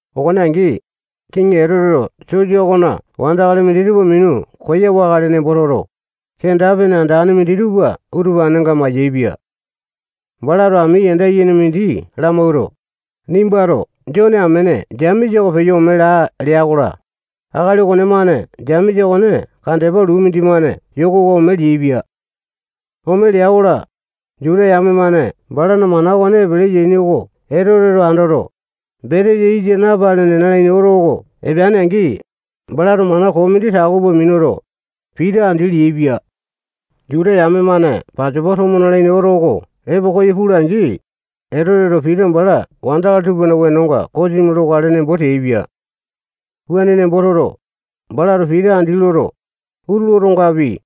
Okone angi, Kiŋi Etoteto sosa okona wandakali minditupa minu koyawakale nembo toto, kenda-pene andane minditupa utupanenga mayaepia. Balato ami yanda yene mindi lamawuato, nimbato Jone amene Jemesa oko peyo ome laa lea-kola, akali okonemane Jemesa okone kandepa luu mindimane yokowa ome leaipia. Ome lea-kola, Juta yame-mane balana mana okone epele yaini oko Etoteto andoto, betesa yisa napalene nalaini oto oko epeane-angi, balato mana koo mindi tako pua minuto, Pita andi leaipia. Juta yame-mane Pasopa tomo nalaini oto oko epo koyo pula-angi, Etoteto Pita bala wandakali tupana wenonga kosimi lokale nembo teaipia. Wuane nembo toto, balato Pita andi loto, utulu otongapi,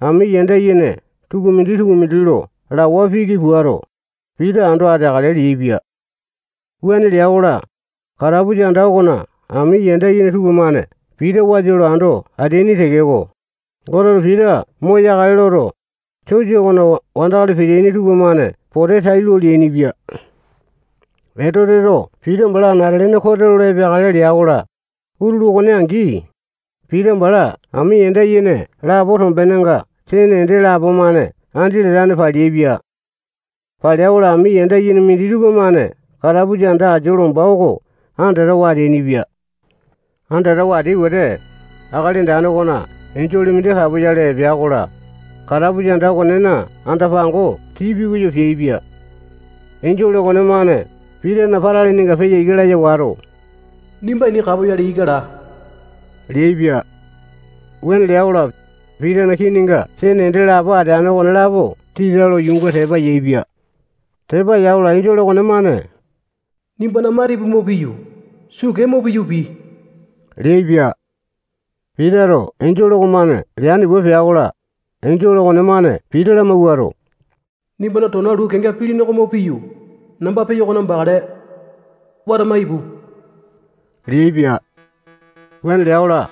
ami yanda yene tukumindi-tukumindi lo lawa piki puato, Pita ando ateakale leaipia. Wuane lea-kola, katapusa anda okona ami yanda yene tupamane Pita wasa lo ando ateaini tekeko, Goteto Pita moyakale loto, sosa okona wandakali peteaini tupamane pote tailo leainipia. Etoteto Pita bala anate-lene kote lolo epeakale lea-kola, utulu okone angi, Pita bala ami yanda yene lapo tombenenga sene ende lapo-mane andi latane paleaipia. Palea-kola, ami yanda yene minditupa-mane katapusa anda asia lomba oko andatawa ateainipia. Andatawa ateai wete, Akali Andane okona enjole mindi kapoyale epea-kola, katapusa anda okonena anda-pango tii pikoyo peaipia. Enjole okonemane Pitana patalininga peyo ika laya wato, nimba ini kapoyale ika laa leaipia. Wuane lea-kola, Pitana kininga sene ende lapo ateane okonelapo tita lo yuunga tepa yaepia. Tepa ya-kola, enjole okonemane nimbana matipu mo piyu, suu kee mo piyu, pii leaipia. Pitato enjole okomane leane pua pea-kola, enjole okonemane Pita lamawuato, nimbana tona luu kenga pilini oko mo piyu, namba peyo okona bakale. Watama ipu leaipia. Wuane lea-kola,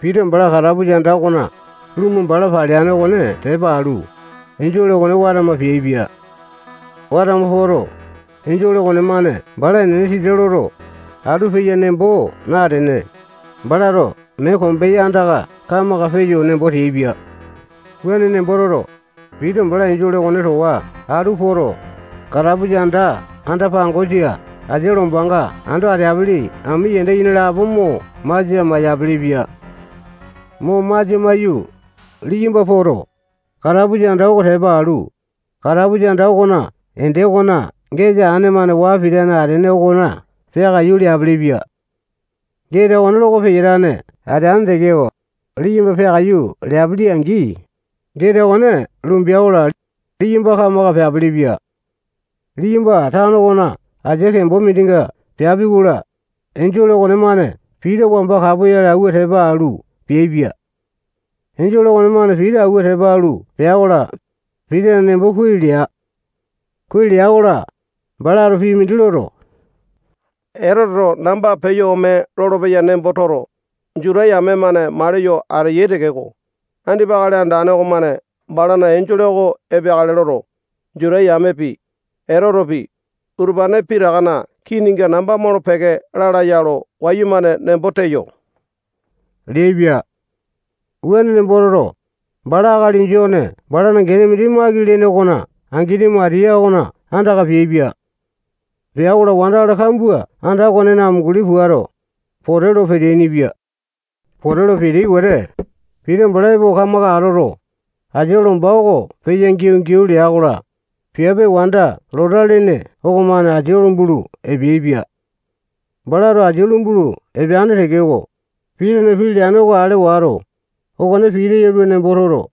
Pita bala katapusa anda okona lumu bala paleane okone tepa alu, enjole okone watama peaipia. Watama poto, enjole okonemane bala enene tita loto, atu peya nembo natene, balato mee kombeya andaka kamaka peyo nembo teaipia. Wuane nembo toto, Pita bala enjole okone towa atu poto, katapusa anda anda-pangosa asia lombanga ando ateapili ami yanda yene lapo mo masia maiyapele-pia. Mo masia maiyu, liyamba poto, katapusa anda oko tepa alu, katapusa anda okona ende okona geta aine-mane waa pitane atene okona peakaiyu leapelepia. Geta okone loko peyatane ateane tekeko, liyamba peakaiyu leapili-angi, geta okone lumbea-kola, liyamba kamaka peapelepia. Liyamba tano okona asia kembo mindinga peapi-kola, enjole okonemane Pita wamba kapoyale awua tepa alu, peaipia. Enjole okonemane Pita awua tepa alu pea-kola, Pitana nembo kuai lea. Kuai lea-kola, balato pii mindi loto, Etoteto namba peyo ome lolopeya nembo toto, Juta yame-mane maliyo ateyai tekeko, andipa Akali Andane okomane balana enjole oko epeakale loto, Juta yamepi, Etotepi, utupane pitakana kininga namba molo-peke lalaya lo wayumane nembo teyo leaipia. Wuane nembo toto, bala akali Jone balana gene mindi Maki lene okona angini Matiya okona andaka peaipia. Pea-kola, wandakali kambua anda okonena amunguli puato, pote lo peteaini-pia. Pote lo peteai wete, Pita bala epo kamaka atoto, asia lomba oko peyo giau-giau lea-kola, piape wanda Lota lene okomane asia lumbulu epeaipia. Balato asia lumbulu epeane tekeko, Pitana pii leane oko ale wato, okone Pita yalua nembo toto,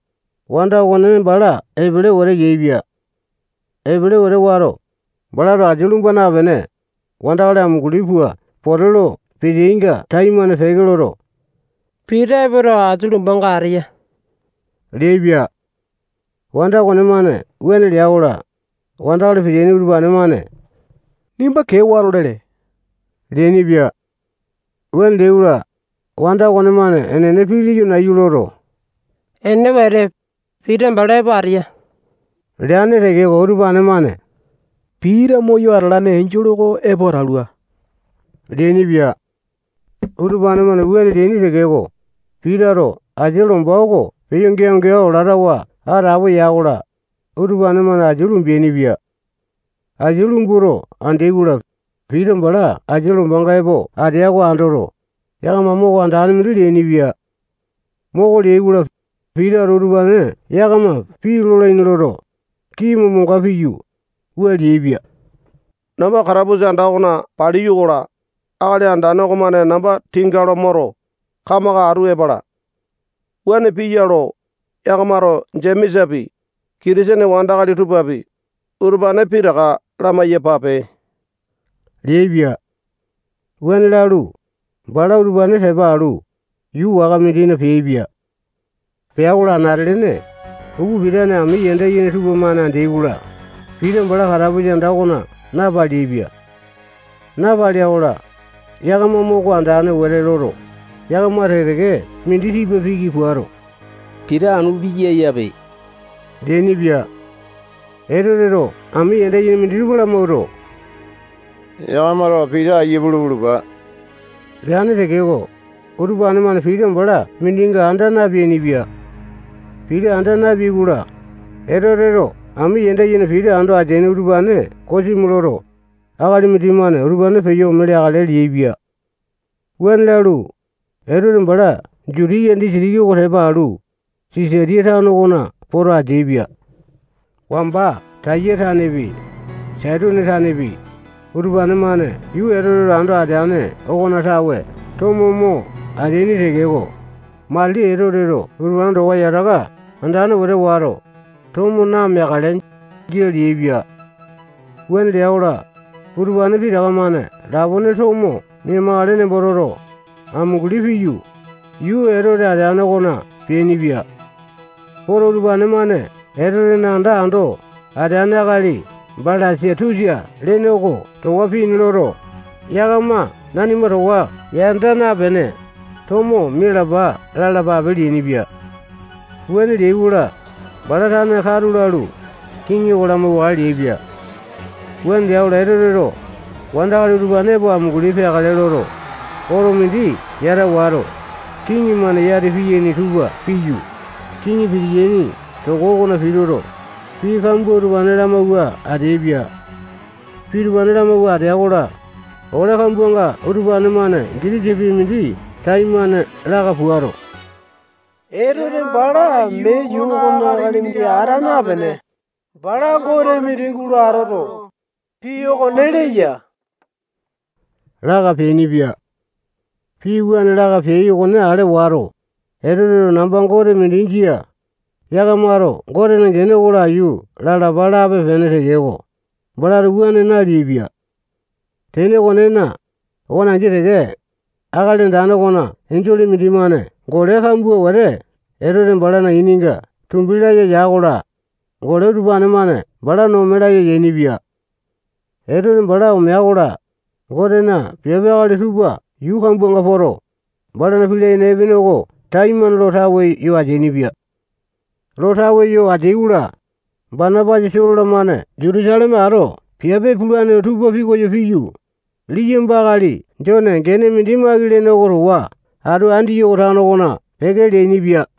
wanda okone bala epele wete yaepia. Epele wete wato, balato asia lumba napene, wandakali amunguli pua pote lo peteainga taimane peke loto, Pita epoto, asia lombanga ateya leaipia. Wanda okonemane wuane lea-kola, wandakali peteaini utupane-mane nimba kee wato lele leainipia. Wuane leai-kola, wanda okonemane enene pii leyo nayu loto, enene wete, Pita bala epo ateya leane tekeko, utupane-mane Pita moyo atalane enjole oko epo atalua leainipia. Utupane-mane wuane leaini tekeko, Pitato asia lomba oko peyo giau-giau latawa atapo ya-kola, utupane-mane asia lumbaini-pia. Asia lumbuto andeai-kola, Pita bala asia lombanga epo atea oko andoto, yakama moko andane mindi leainipia. Moko leai-kola, Pitato utupane yakama pii lolaini loto, kini momonga piyu, wua leaipia: Namba katapusa anda okona paliyo-kola, Akali Andane okomane namba tinga lo moto, kamaka atu epala. Wuane piya lo, yakamato Jemesapi, Kitisene wandakali tupapi, utupane pitaka lamai-yapape leaipia. Wuane lalu, bala utupane tepa alu, yuu waka mindina peaipia. Pea-kola, anate-lene upa pitane ami yanda yene tupamane andeai-kola, Pita bala katapusa anda okona napaleaipia. Napalea-kola, yakama moko andane wete loto, yakama teke-teke mindi tipa piki puato, Pita anu piya yape leainipia. Etoteto ami yanda yene minditupa lamawuato, yakamato Pita aiya pulu pulupa leane tekeko, utupane-mane Pita bala mindinga anda napeainipia. Pita anda napeai-kola, Etoteto ami yanda yene Pita ando ateaini utupane kosimi loto, akali mindimane utupane peyo ome leakale leaipia. Wuane lalu, Etote bala Jutiya disitiki oko tepa alu, Sisatiya tano okona poto ateaipia. Wamba Taya tanepi, Saitone tanepi, utupane-mane yuu Etoteto ando ateane okona tawe tomo mo ateaini tekeko, matili Etoteto utupane towa yataka andane wete wato, tomo nameakale, jia leaipia. Wuane lea-kola, utupane pitaka-mane lapone tomo mia-makale nembo toto, amunguli piyu, yuu Etote ateane okona peainipia. Poto, utupane-mane Etotena anda ando ateane akali Balasatusa lene oko towa pii ini loto, yakama nanima towa yanda napene, tomo mialapa lalapape leainipia. Wuane leai-kola, bala tane katu lalu, kiŋi oko lamauwakale leaipa. Wuane lea-kola, Etoteto wandakali utupane epo amunguli peakale loto, oto mindi yata wato, kiŋi-mane yati piyaini tupa piyu, kiŋi pitiyaini toko okona pituto, pii kambua utupane lamawua ateaipia. Pii utupane lamawua atea-kola, ole kambuanga utupane-mane gitisa pii mindi taimane laka puato, Etote bala mee yuu okona akali mindi ata napene, bala gote mindi gulo atoto, pii okone leya laka peainipia. Pii wuane laka peai okone ale wato, Etoteto namba gote mindi jia, yakamato Gotena gene oko laiyu lalapa lape-pene tekeko, balato wuane naleaipia. Tene okonena, okone angi teke, Akali Andane okona enjole mindimane gole kambua wete Etote balana ininga tumbi laya ya-kola, gole utupane-mane bala no ome laya yainipia. Etote bala omea-kola, Gotena piape akali tupa yuu kambuanga poto, balana pii layene epene oko taimane lo tawe yo ateainipia. Lo tawe yo ateai-kola, Banapasa, Solo-lamane Jutusaleme ato piape pulane tupa pikoyo piyu, liyamba akali Jone gene mindi Maki lene oko towa atu Andiyoko tano okona peke leainipia.